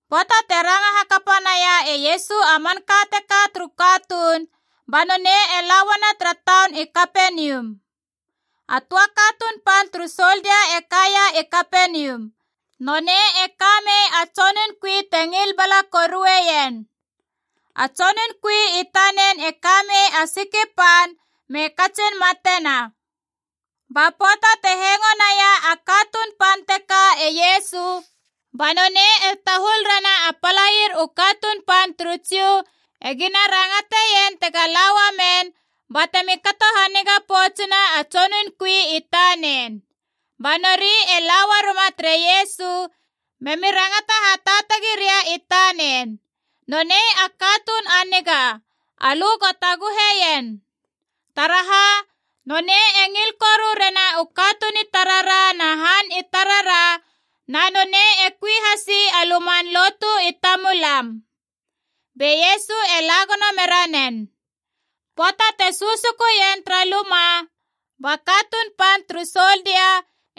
Pöata te ranga hakapa naia e Iesu a manka teka turu katuun, ba nonei e la uana tara taun i Kapenium. A töa katuun pan turu soldia e kaia i Kapenium. Nonei e ka mei a tsonun kui te ngil bala korueien. A tsonun kui i tanen e ka mei a siki pan me katsin matena. Ba pöata te hengo naia a katuun pan teka e Iesu, ba nonei e tahul rena a palair u katuun pan turu Jiu e gina rangateien tega la uamen batemi kato haniga poutsena a tsonun kui i tanen. Ba nori e la uaruma tere Iesu memi rangata hataatagi ria i tanen, “Nonei a katuun a niga, alö go taguheien. Taraha? Nonei e ngil koru rena u katuun i tarara na han i tarara na nonei e kui hasi a luman lotu i tamulam.” Be Iesu e la gono mera nen. Pöata te susukuien tara luma ba katuun pan turu soldia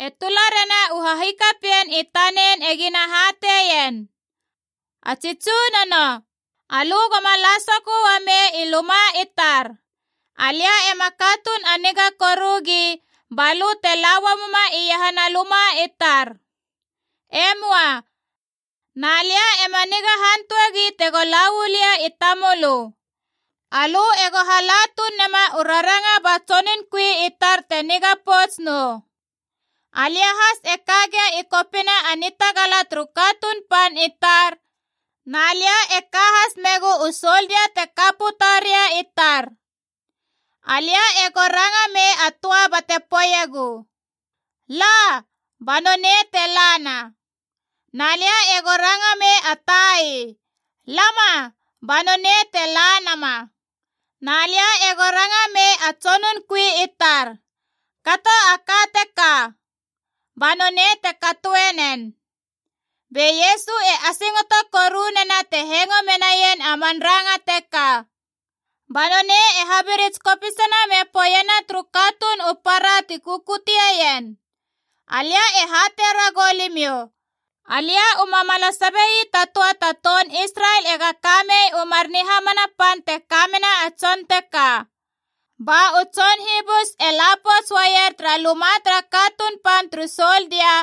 e tula rena u hahikapien i tanen e gina hateien, “A tsi tsunono, alö goma la sokö uamei i luma i tar. Alia ema katuun a niga korugi ba lö te la uamuma iahana luma i tar. E möa. Na lia ema niga hantuegi tego la uu lia i tamölö. Alö ego hala tuun nema u raranga ba tsonun kui i tar te niga pouts nou. Alia has e ka gia i kopina a nitagala turu katuun pan i tar, na lia e ka has megu u soldia te ka puta ria i tar. Alia ego ranga mei a töa bate poeiegu, ‘La’ ba nonei te lana. Na lia ego ranga mei a tai, ‘Lama’ ba nonei te la nama. Na lia ego ranga mei a tsonun kui i tar, ‘Kato a ka teka’ ba nonei te katoe nen.” Be Iesu e asingoto korunena te hengo menaien a man ranga teka. Ba nonei e habirits kopisina me poeiena turu katuun u para ti kukuteien, “Alia e hatei ragou limiou, alia u mamala sabe ii ta töa ta toun Israel tega ka mei u mar nihamana pan te kamena a tson teka.” Ba u tson hibus e la pouts uaier tara luma tara katuun pan turu soldia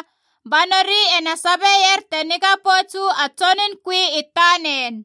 ba nori e na sabeier te niga pouts uu a tsonun kui i tanen.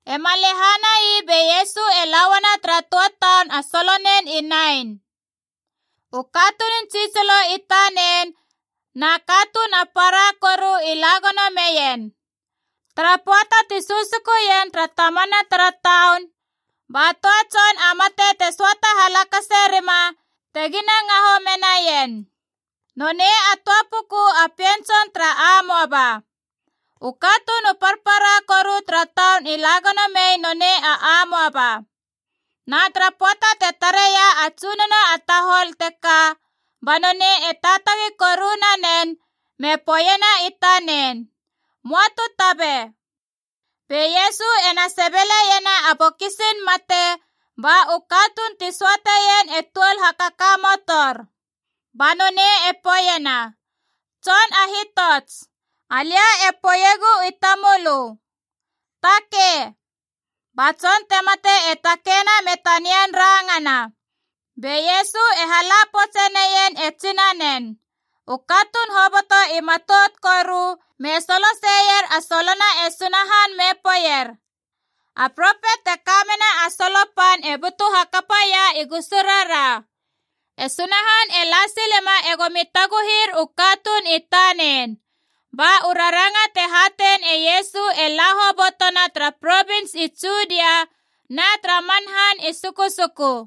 E ma lehanai be Iesu e la uana tara töa taun a solonen i Nain. U katunun tsitsilo i tanen na katuun a para koru i la gono meien. Tara pöata ti susukuien tara tamana tara taun, ba töa tson a mate te söata halakase rima tegina ngaho menaien. Nonei a töa puku a pien tson tara amoaba. U katuun u parpara koru tara taun i la gono mei nonei a amoaba. Na tara pöata te tareia a Tsunono a tahol teka, ba nonei e taatagi koru nanen me poeiena i tanen, “Möa tu tabe.” Be Iesu ena sebeleiena a bokisin mate, ba u katuun ti söateien e tuol hakakamotor. Ba nonei e poeiena, “Tson a hitots, alia e poeiegu i tamölö, takei!” Ba tson te mate e takeina me tanian rangana. Be Iesu e hala poutse neien e tsinanen. U katuun hoboto i matout koru, me solo seier a solona e Sunahan me poeier, “A propet te kamena a solo pan e butu hakapaia i gusurara! E Sunahan e la silema e gomi taguhir u katuun i tanen!” Ba u raranga te hatein e Iesu e la hobotona tara provins i Judia na tara man han i sukusuku.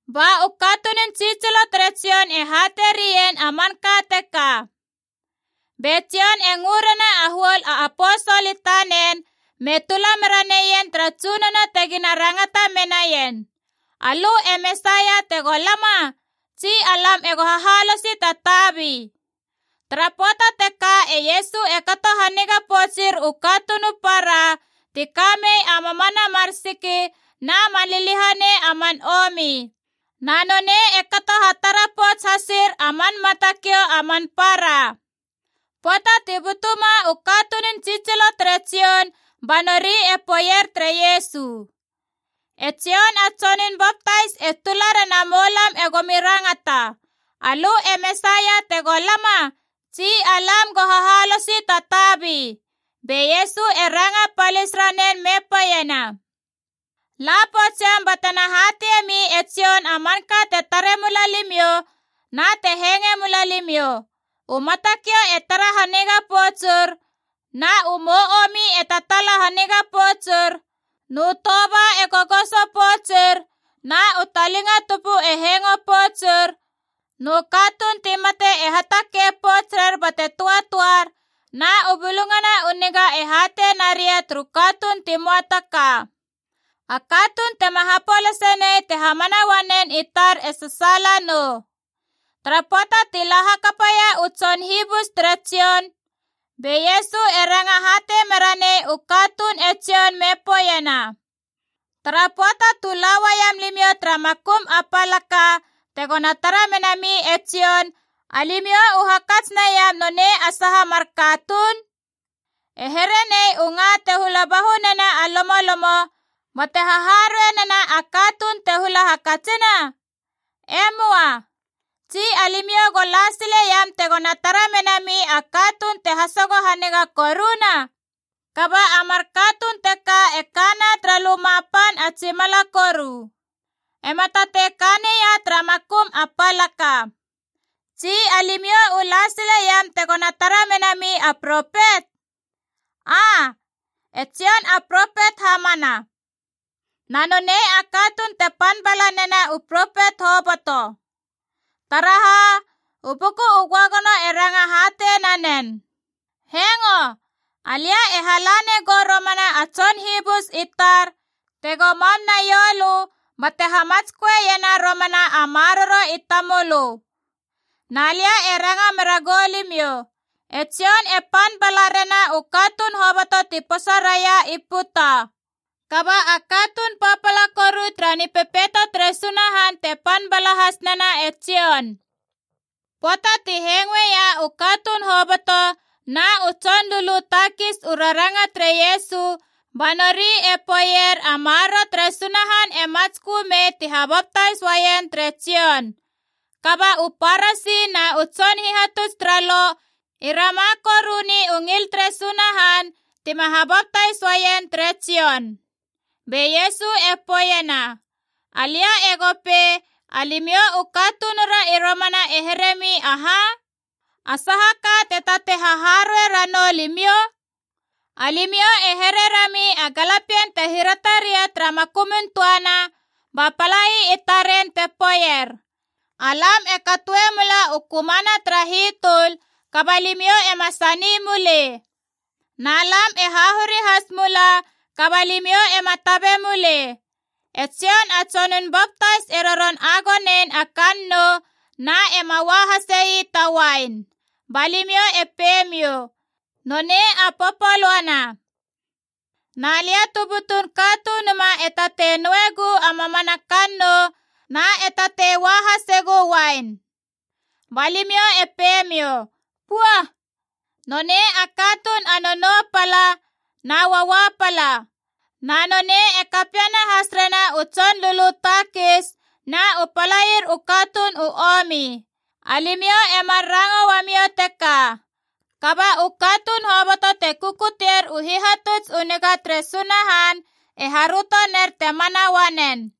Ba u katunun tsitsilo tere Jon e hateie rien a manka teka. Be Jon e ngö rena a huol a aposol i tanen me tula mera neien tara Tsunono tegina rangata menaien, “Alö e Mesaia tego lama, tsi alam ego hahalosi ta tabi?” Tara pöata teka e Iesu e kato haniga poutsir u katuun u para ti ka mei a mamana mar siki na man liliahanei a man omi. Na nonei e kato hatara pouts hasir a man matakiou a man para. Pöata ti butuma u katunun tsitsilo tere Jon ba nori e poeier tere Iesu, “E Jon a Tsonun Baptais e tula rena moulam e gomi rangata, ‘Alö e Mesaia tego lama, tsi alam go hahalosi ta tabi?’” Be Iesu e ranga palis ranen me poeiena, “La poutsiam batena hateie mi e Jon a manka te tare mula limiou na te hengoe mula limiou: u matakiou e tara haniga poutsur, na u mou omi e tataala haniga poutsur, nu toba e gogoso poutsur, na u talinga tupu e hengo poutsur, nu katuun ti mate e hatakei pouts rer bate töatöar, na u Bulungana u Niga e hatei naria turu katuun ti möa ta ka. A katuun tema hapolase nei te hamana uanen i tar e sasaala nou!” Tara pöata ti la hakapaia u tson hibus tere Jon, be Iesu e ranga hatei mera nei u katuun e Jon me poeiena, “Tara pöata tu la uaiam limiou tara makum a palaka tegona tara menami e Jon, alimiou u hakats naiam nonei a saha mar katuun? E here nei u nga te hula bahunena a lomolomo bate haharuei nena a katuun te hula hakatsina? E möa. Tsi alimiou u la sileiam tegona tara menami a katuun te hasogo haniga koruna? Kaba a mar katuun teka e kana tara luma pan a tsimala koru. E ma tatei ka neia tara makum a palaka! Tsi alimiou u la sileiam tegona tara menami a propet? Aa, e Jon a propet hamana. Na nonei a katuun te pan bala nena u propet hoboto. Taraha? U Buku u Göagono e ranga hatei nanen: ‘Hengo! Alia e hala negou romana a tson hibus i tar tego mam naiou lö, bate hamatsköena romana a maroro i tamölö.’ “Na lia e ranga mera goulimiou, e Jon e pan bala rena u katuun hoboto ti posa raia i puta. Kaba a katuun papala koru tara Nipepeito tere Sunahan te pan bala has nena e Jon.” (Pöata ti hengoeia u katuun hoboto na u tson lulu takis u raranga tere Iesu, ba nori e poeier a maroro tere Sunahan e matskö mei ti habaptais uaien tere Jon. Kaba u Parasi na u tson hihatuts tara Lo i rama koruni u ngil tere Sunahan tima habaptais uaien tere Jon.) Be Iesu e poeiena, “Alia ego pei alimiou u katunura i romana e heremi aha? A saha ka te tatei haharuei ranou limiou? Alimiou e here rami a galapien te hirata ria tara makumun töana, ba palai i taren te poeier, ‘Alam e katoe mula u kömana tara hitöl, kaba limiou ema sani mulei! Na lam e hahuri has mula, kaba limiou ema tabe mulei!’ E Jon a Tsonun Baptais e roron agonein a kannou na ema ua hase ii ta uain. Ba limiou e pei miou, ‘Nonei a popolöana!’ Na lia tu butun Katunuma e tatei nouegu a mamana kannou na e tatei ua hasegu uain. Ba limiou e pei miou, ‘Pua! Nonei a katuun a nonou pala na uaua pala! Na nonei e kapiena has rena u tson lulu takis na u palair u katuun u omi!’ Alimiou emar ranga uamiou teka. Kaba u katuun hoboto te kukutier u hihatuts u niga tere Sunahan e haröto ner te mana uanen.”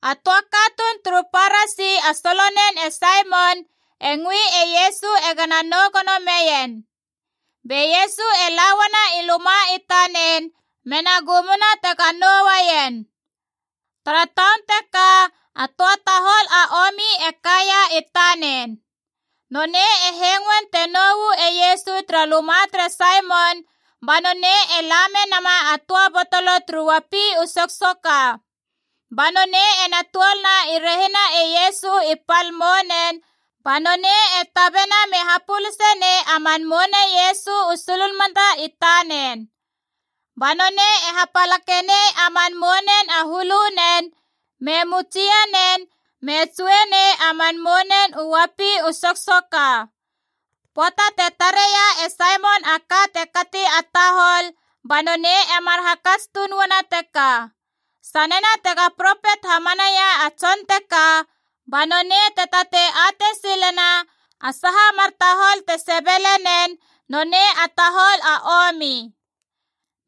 A töa katuun turu Parasi a solonen e Saimon e ngöi e Iesu e gana nou gono meien. Be Iesu e la uana i luma i tanen mena gumuna tega nouaien. Tara taun teka a töa tahol a omi e kaia i tanen. Nonei e hengoen te nou uu e Iesu tara luma tere Saimon, ba nonei e la menama a töa botolo turu uapi u soksoka. Ba nonei ena tuolna i rehina e Iesu i pal mounen ba nonei e tabena me hapuluse nei a man mouna e Iesu u sulunmata i tanen. Ba nonei e hapalake nei a man mounen a hulunen, me mutsie nena, me tsue nei a man mounen u uapi u soksoka. Pöata te tareia e Saimon a ka te kati a tahol, ba nonei emar hakats tuun uana teka, “Sanena tega propet hamanaia a tson teka, ba nonei te tatei atei silena a saha mar tahol te sebele nen, nonei a tahol a omi!”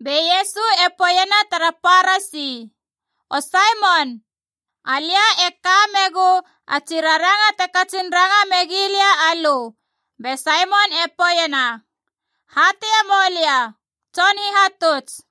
Be Iesu e poeiena tara Parasi, “O Saimon, alia e ka megu a tsi raranga te katsin ranga megi lia alö.” Be Saimon e poeiena, “Hateie moulia, Tson Hihatuts.”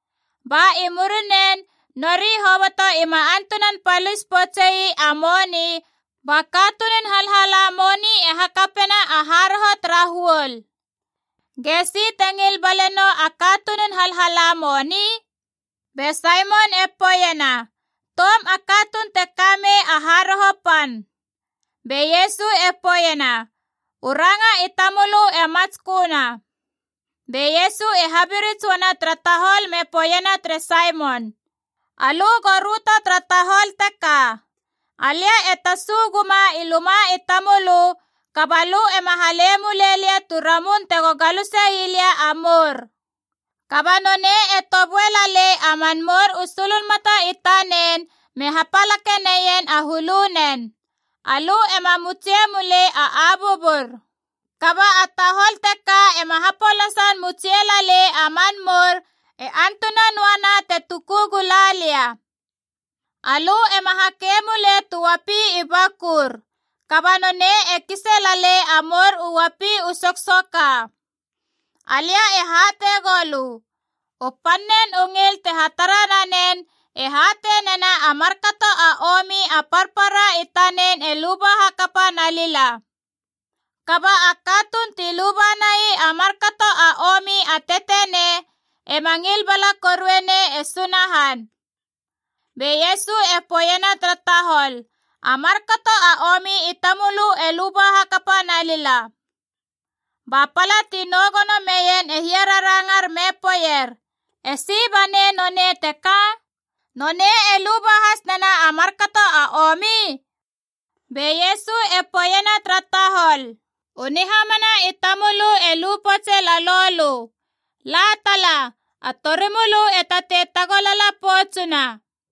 Ba i murinen nori hoboto ima antunan palis poutsei a moni, ba katunun halhala moni e hakapena a haroho tara huol. Gesi te ngil bale nou a katunun halhala moni?” Be Saimon e poeiena, “Toum a katuun te ka mei a haroho pan.” Be Iesu e poeiena, “U ranga i tamölö e matsköna.” Be Iesu e habirits uana tara tahol me poeiena tere Saimon, “Alö go röto tara tahol teka. Alia e tasu guma i luma i tamölö, kaba lö ema halei mulei lia tu ramun tego galuse ii lia a mour. Kaba nonei e toböe lalei a man mour u sulunmata i tanen me hapalake neien a hulunen. Alö ema mutsie mulei a abuabur. Kaba a tahol teka ema hapolasan mutsie lalei a man mour e antuna noana te tuku gula lia. Alö ema hakei mulei tu uapi i bakur. Kaba nonei e kise lalei a mour u uapi u soksoka. Alia e hatei goulö, u pannen u ngil te hatara nanen e hatei nena a markato a omi a parpara i tanen e luba hakapa nalila. Kaba a katuun ti luba nai a markato a omi a tetenei ema ngil bala korue nei e Sunahan.” Be Iesu e poeiena tara tahol, “A markato a omi i tamölö e luba hakapa nalila!” Ba pala ti nou gono meien e hiararangar me poeier, “Esi banei nonei teka? Nonei e luba has nena a markato a omi?” Be Iesu e poeiena tara tahol, “U nihamana i tamölö e lu poutse lalou lö! La tala, a torimölö e tatei tagolala poutsuna.”